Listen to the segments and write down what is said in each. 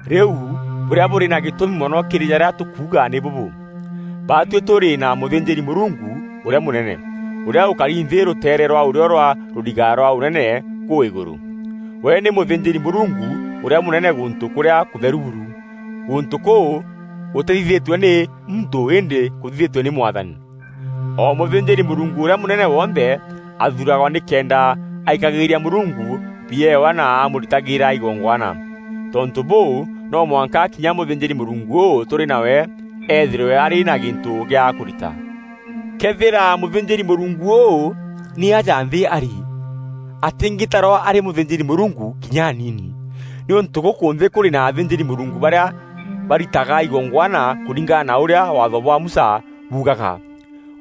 Rîu bûrîa bûrî na gîtûmi mono kîrî jarîa tûkuuga nî bûbû: baatuî tûrî na mûthînjîri-Mûrungu ûrîa mûnene, ûrîa ûkari nthî rûteere rwa ûrîo rwa rûriga rwa Ûnene kûu îgûrû. We nî mûthînjîri-Mûrungu ûrîa mûnene gûntû kûrîa kûtheru buru, gûntû kûu gûtîthithîtue nî muntû îndî kûthithîtue nî Mwathani. O mûthînjîri-Mûrungu ûrîa mûnene wonthe athuuragwa nîkenda aikagîria Mûrungu biewa na amûritagîra igongwana. Tontû bûû, no mwanka kinya mûthînjîri-Mûrungu ûû tûrî nawe eethîrwe arî na gîntû gîa kûrita. Këethîra mûthînjîri-Mûrungu ûû nî aja nthî arî, atîngîtarwa arî mûthînjîri-Mûrungu kinya anini, nîûntû gûkû nthî kûrî na athînjîri-Mûrungu barîa baritaga igongwana kûringana na ûrîa Waatho bwa Musa buugaga.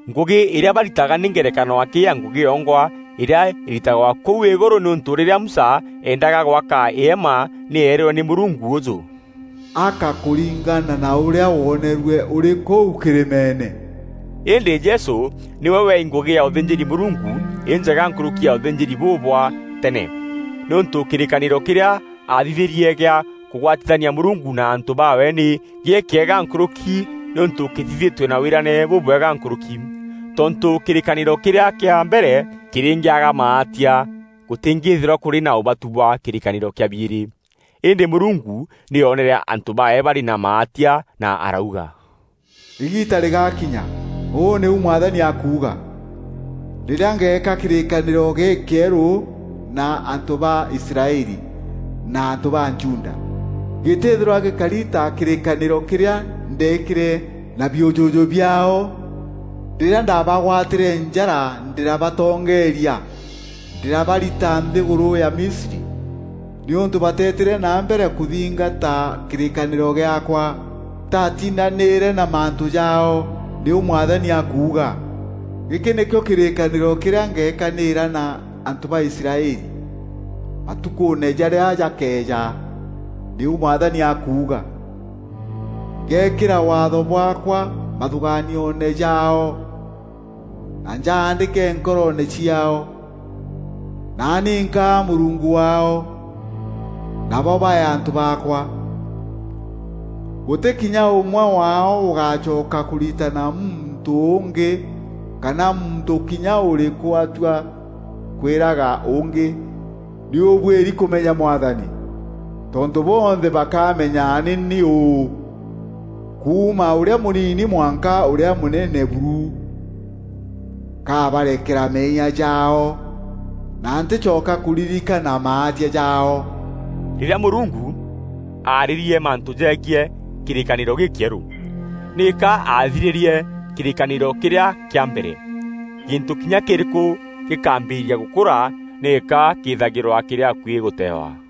Ngûgî îrîa baritaga nî ngerekano akî ya ngûgî yongwa îrîa îritagwa kûu îgûrû nîûntû rîrîa Musa eendaga gwaka îema nî eerîrwe nî Mûrungu ûjû, “Aka kûringana na ûrîa woonerue ûrî kûu kîrîmeene.” Îndî Jesû nîwe weei ngûgî ya ûthînjîri-Mûrungu înjega nkûrûki ya ûthînjîri bûu bwa tene, nîûntû kîrîkanîro kîrîa aathithîrie gîa kûgwatithania Mûrungu na antû baawe nî gîkîega nkûrûki nîûntû kîthithîtue na wîrane bûbwega nkûrûki. Tontû kîrîkanîro kîrîa kîa mbere kîrîngîaga maatia, gûtîngîîthîrwa kûrî na ûbatu bwa kîrîkanîro kîa biîrî. Îndî Mûrungu nî oonere antû baawe barî na maatia na arauga, “Îgiita rîgakinya, ûu nîu Mwathani akuuga, rîrîa ngeeka kîrîkanîro gîkîerû na antû ba Israeli na antû ba Juda. Gîtîîthîrwa gîkari ta kîrîkanîro kîrîa ndeekîre na biûjûjû biaao, rîrîa ndabagwatîre njara ndîrabatongeeria ndîrabarita nthîgûrû ya Misri; nîûntû bateetîre na mbere kûthingata kîrîkanîro gîaakwa, ntaatindanîîre na mantû jaao, nîu Mwathani akuuga. Gîkî nîkîo kîrîkanîro kîrîa ngeekanîra na antû ba Israeli, matukûûne jarîa jakeeja, nîu Mwathani akuuga; ngeekîra Waatho bwaakwa mathûgaanioone jaao, na njaandîke nkoroone ciaao. Naani nkaa Mûrungu waao, nabo baee antû baakwa. Gûtî kinya ûmwe waao ûgacoka kûritana muntû ûngî, kana muntû kinya ûrîkû atua kwîraga ûngî, ‘Nî ûbwîrî kûmenya Mwathani.’ Tontû bonthe bakamenya nî ni ûû, kuuma ûrîa mûnini mwanka ûrîa mûnene buru. Nkaabarekera meeyia jaao, na ntîcoka kûrîrîkana maatia jaao.” Rîrîa Mûrungu aarîrie mantû jegiî kîrîkanîro gîkîerû, nîka aathirîrie kîrîkanîro kîrîa kîa mbere. Gîntû kinya kîrîkû gîkaambîrîria gûkûra nîka kîîthagîrwa kîrî akuî gûteewa.